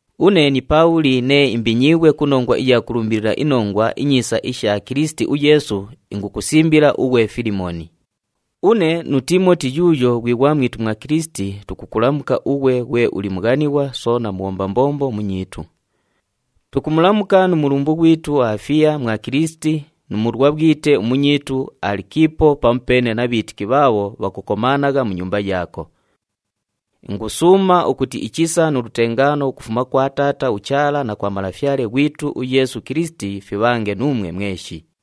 Une ni Paabhuli nee imbinyiighwe ku nongwa iya kulumbilila iNongwa iNyiisa isha Kilisiti uYeesu, ingukusimbila ughwe Filimooni. Une nu Tiimoti yuuyo ghwi ghwamwitu mwa Kilisiti, tukukulamuka ughwe ghwe uli mughanighwa soona mubhomba mbombo munyiitu. Tukumulamuka nu mulumbu ghwitu uAfiya mwa Kilisiti nu mulwabhwite umunyiitu uAlikiipo pamupeene na bhiitiki bhaabho bhakukomaanagha mu nyumba yaako. Ingusuuma ukuti ichisa nu lutengaano ukufuma kwa Taata uChaala na kwa Malafyale ghwitu uYeesu Kilisiti fibhange nuumwe mweshi.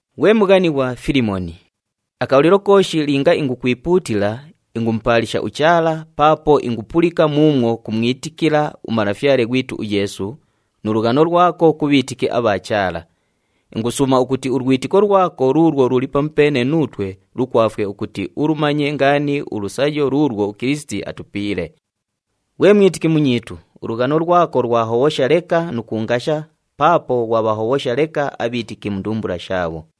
Ghwe mughanighwa Filimooni, akabhalilo kooshi linga ingukwipuutila, ingumupaalisha uChaala paapo ingupulika muumwo kumwitikila uMalafyale ghwitu uYeesu, nu lughano lwako ku bhiitiki abha Chaala. Ingusuuma ukuti ulwitiko lwako luulwo luli pamupeene nuutwe lukwafwe ukuti ulumanye ngaani ulusayo luulwo uKilisiti atupiile. Ghwe mwitiki munyiitu, ulughano lwako lwahobhosha leka nu kuungasha paapo ghwabhahobhosha leka abhiitiki mu ndumbula shaabho.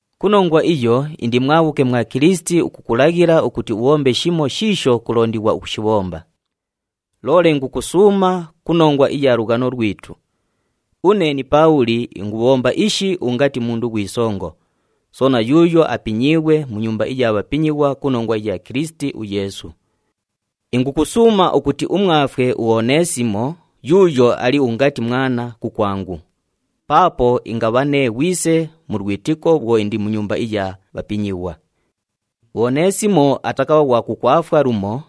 Ku nongwa iyo, indi mwabhuke mwa Kilisiti ukukulaghila ukuti ubhombe shimo shiisho kulondighwa ukushibhomba. Loole ingukusuuma ku nongwa iya lughano lwitu. Une ni Paabhuli ingubhomba ishi ungati mundu ghwi songo, soona yuuyo apinyiighwe mu nyumba iya bhapinyighwa ku nongwa iya Kilisiti uYeesu. Ingukusuuma ukuti umwafwe uOneesimo yuuyo ali ungati mwana kukwangu, paapo ingabha nee ghwise mu lwitiko bhwo indi mu nyumba iya bhapinyighwa. UOneesimo atakabha ghwa kukwafwa lumo,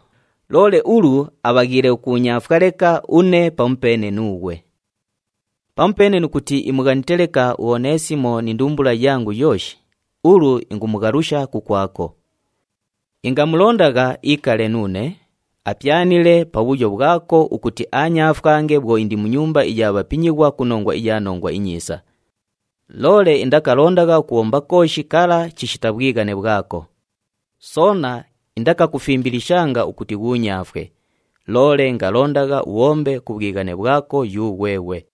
loole ulu abhaghiile ukuunyaafwa leka une pamupeene nuughwe. Pamupeene nu kuti imughanite leka uOneesimo ni ndumbula yangu yooshi, ulu ingumughalusha kukwako. Ingamulondagha iikale nuune, apyanile pabhuyo bhwako ukuti aanyaafwange bhwo indi mu nyumba iya bhapinyighwa ku nongwa iya Nongwa iNyiisa. Loole indakalondagha ukubhomba kooshi kala chishita bhwighane bhwako. Soona indakakufimbilishanga ukuti ghuunyaafwe, loole ingalondagha ubhombe ku bhwighane bhwako yughweghwe.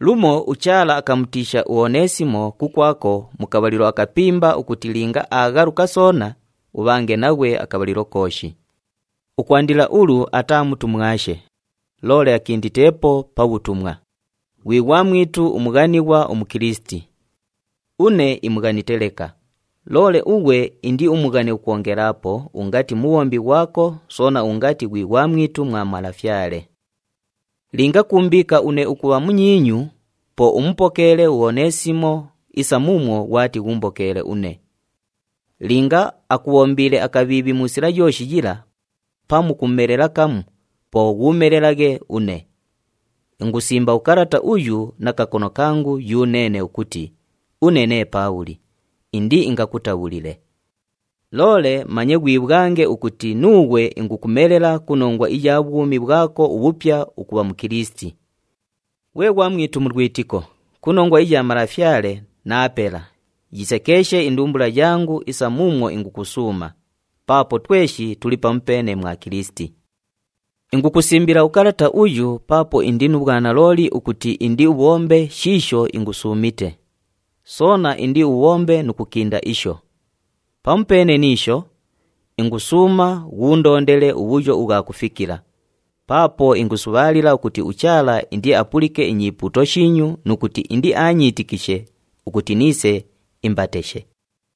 Lumo uChaala akamutiisha uOneesimo kukwako mu kabhalilo akapimba ukuti linga aaghaluka soona, ubhange naghwe akabhalilo kooshi. Ukwandila ulu ataa mutumwashe, loole akinditeepo pa bhutumwa, ghwi ghwamwitu umughanighwa uMukilisiti. Une imughanite leka, loole ughwe indiumughane ukwongelaapo ungati mubhombi ghwako soona ungati ghwi ghwamwitu mwa Malafyale. Linga kuumbiika une ukubha munyiinyu, po mupokeele uOneesimo isa muumwo ghwati ghuumbokeele une. Linga akubhombiile akabhiibhi mu sila yooshi yila, pamu kumumelela kamu, po ghuumelelaghe une. Ingusimba ukalata uyu na kakono kangu yuneene ukuti, “Une nee Paabhuli, indiingakutabhulile.” Loole manye ghwibhwange ukuti nuughwe ingukumelela ku nongwa iya bhwumi bhwako ubhupya ukubha Mukilisiti. Ghwe ghwamwitu mu lwitiko, ku nongwa iya Malafyale, naapela, yisekeeshe indumbula yangu isa muumwo ingukusuuma, paapo tweshi tuli pamupeene mwa Kilisiti. Ingukusimbila ukalata uyu paapo indi nu bhwanalooli ukuti indiubhombe shiisho ingusuumite, soona indiubhombe nu kukinda isho. Pamupeene ni isho, ingusuuma ghuundondele ubhuyo ubhwa kufikila, paapo ingusubhaalila ukuti uChaala indiapulike inyipuuto shiinyu nu kuti indiaanyiitikishe ukuti niise imbateshe.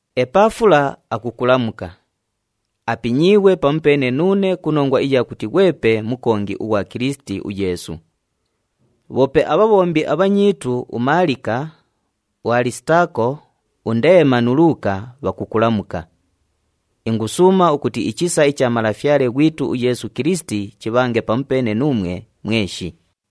UEpafula akukulamuka. Apinyiighwe pamupeene nuune ku nongwa iya kuti ghwepe mukongi ughwa Kilisiti uYeesu. Bhoope abhabhombi abhanyiitu uMaalika, uAlisitaako, uNdeema nu Luuka, bhakukulamuka. Ingusuuma ukuti ichisa icha Malafyale ghwitu uYeesu Kilisiti chibhange pamupeene nuumwe mweshi.